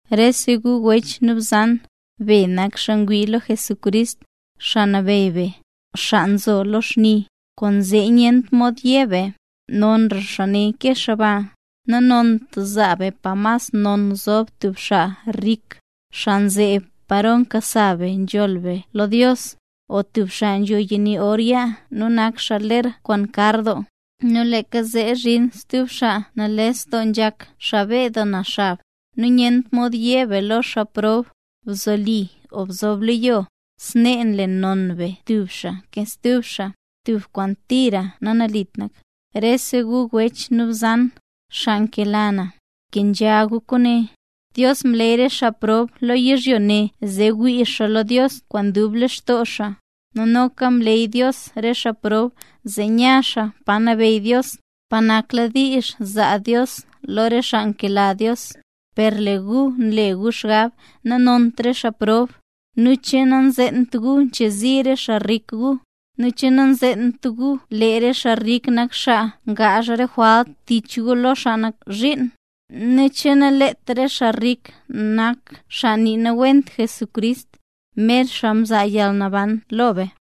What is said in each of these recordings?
Rese gu wech nu bzan, be nak xaa ngwii lo Jesucrist, Xaa Nabeyy be, xaa nzo lo xni. Kwaanzee nyentra mod yé be: “Nonra xaa ne ke xaa ba”. Nanont zaa be pa mas non zob tub xaa rik, xaa nzeb paro nkasa be nzholl be lo Dios, o tub xaa nzho yani or yaa nu nak xaa ler kwaan kar doo. Nu leeka zee zhin stub xaa nales doo nzhak, xaa beed doo na xab, nu nanont yé be lo xaa prob: “Bzoli o bzob lo yo”. Snee nle non be tub xaa ke stub xaa, tub kwaan tira nanalit nak. Rese gu wech nu bzan, xaa nkela na, bkenzha gu kwaane. Dios mleey re xaa prob lo yizhyo ne, zee wii xaa lo Dios kwaan dub lextoo xaa. Noka mleey Dios re xaa prob zee nya xaa pa nabeyy Dios, pa nakladiizh zaa Dios lo re xaa nkela Dios. Per lee re gu nle gu xgab nanont re xaa prob. Nu, ¿che nanzeent gu nchezi re xaa rik gu? nu, ¿che nanzeent gu lee xaa rik nak xaa ngaazh re jwalt tich gu lo xaa nak zhiin? nu, ¿che naleet re xaa rik nak xaa naniiwent Jesucrist, mer xaa mzaa yalnaban lo be?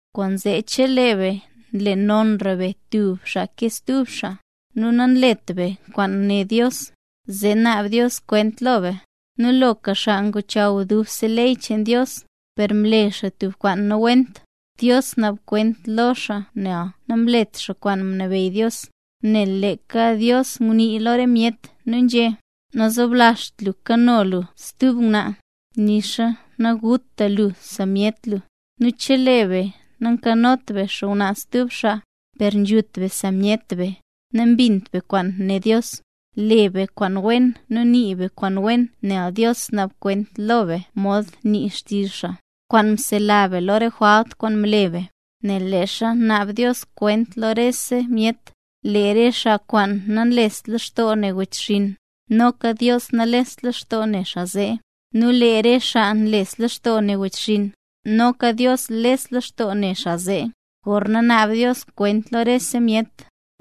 Kwaanzee chelee be nle nonra be tub xaa ke stub xaa, nu nanlet be kwaan né Dios, zee naab Dios kwent lo be. Nu loka xaa ngozhaw dubse ley cheen Dios, per mle xaa tubka kwaan nawent, Dios naab kwent lo xaa nel namlet xaa kwaan mnabeyy Dios. Nel leeka Dios ngunii lo re myet, nu nzhé: “Nazoblazht lu kano lu stub ngwnaa”, nu nixa “Naguta lu sa myet lu”. Nu chelee be nankanot be xngwnaa stub xaa, per nzhut be sa myet be, nambint be kwaan né Dios. Le be kwaan wen nu nii be kwaan wen nel Dios naab kwent lo be mod nii xtizh xaa, kwaan nsela be lo re jwalt kwaan mle be. Nel leezha naab Dios kwent lo rese myet, lee re xaa kwaan namlest lextoo ne wechxinn, noka Dios nalest lextoo ne xaa zee. Nu lee re xaa nles lextoo ne wechxinn, noka Dios les lextoo ne xaa zee, gorna naab Dios kwent lo rese myet.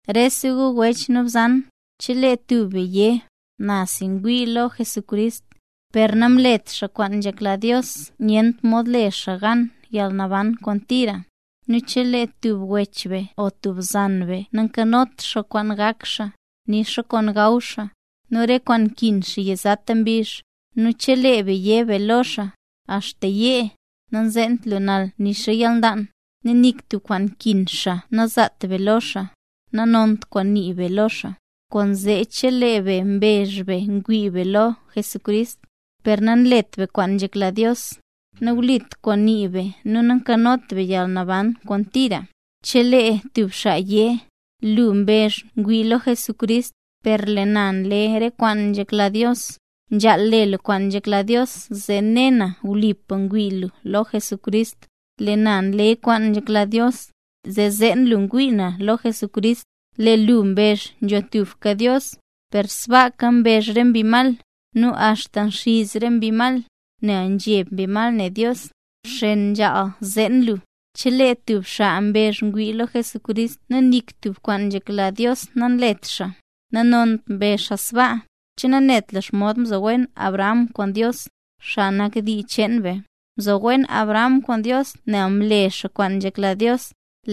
Rese gu wech nu bzan. Chelee tub be yé: “Na si ngwii lo Jesucrist”, per nanlet xaa kwaan nzhekla Dios nyent mod le xaa gan yalnaban kwaan tira. Nu chelee tub wech be o tub bzan be nankanot xaa kwaan gak xaa, nu nixa kwaan gaw xaa, nu re kwaan nkin xaa yizata mbizh, nu chelee be yé be lo xaa: “Axta yee. Nazeent lu nal nu nixa yalnlaan”, nu nik tub kwaan nkin xaa nazaat be lo xaa, nanont kwaan ngunii be lo xaa. Kwaanzee chelee be mbezh be ngwii be lo Jesucrist, per nanlet be kwaan nzhekla Dios, nawlit kwaan nii be nu nankanot be yalnaban kwaan tira. Chelee tub xaa yé: “Lu mbezh ngwii lu lo Jesucrist, per lee na nle re kwaan nzhekla Dios. Nzhaal le lu kwaan nzhekla Dios zee ne na wlipa ngwii lu lo Jesucrist. Lee na nle kwaan nzhekla Dios, zee zeen lu ngwii na lo Jesucrist. Lee lu mbezh nzho tubka Dios. Per sbaaka mbezh re mbi mal, nu axta nxiz re mbi mal, nel nzheb mbi mal ne Dios.” ¡Bxen! Nzhaal zeen lu, chelee tub xaa mbezh ngwii lo Jesucrist nu nik tub kwaan nzhekla Dios nanlet xaa, nanont mbezh xaa sbaa. ¿Che nanet lu xomod mzo wen Abraham kwaan Dios, xaa nak dii cheen be? Mzo wen Abraham kwaan Dios nel mle xaa kwaan nzhekla Dios,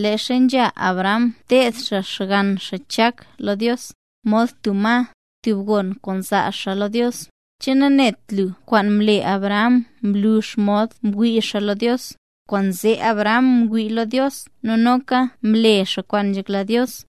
leezha nzha Abraham teed xaa xgann xaa Chak lo Dios, mod tub ma, tub gon kwaan zaa xaa lo Dios. ¿Che nanet lu kwaan mle Abraham mlu xomod mwii xaa lo Dios? Kwaanzee Abraham mwii lo Dios nu noka mle xaa kwaan nzhekla Dios.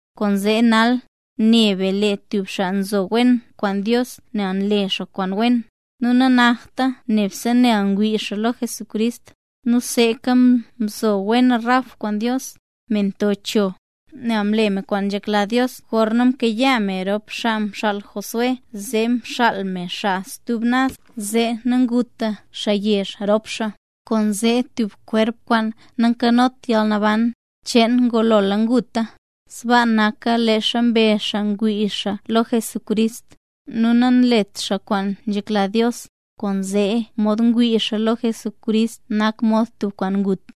Kwaanzee nal, ne be lee tub xaa nzo wen kwaan Dios nel nle xaa kwaan wen, nu nanakta nebse nel ngwii xaa lo Jesucrist. Nu seeka mzo wen Rahab kwaan Dios, me mto cho. Nel mle me kwaan nzhekla Dios gorna mkayaa me rop xaa mxaal Josué nu zee mxaal me xaa stub naz, zee naguta xaa yezh rop xaa. Kwaanzee tub kwerp kwaan nankanot yalnaban cheen ngulola nguta, sbaa naka leezha mbezh xaa ngwii xaa lo Jesucrist, nu nanlet xaa kwaan nzhekla Dios; kwaanzee mod ngwii xaa lo Jesucrist nak mod tub kwaan ngut.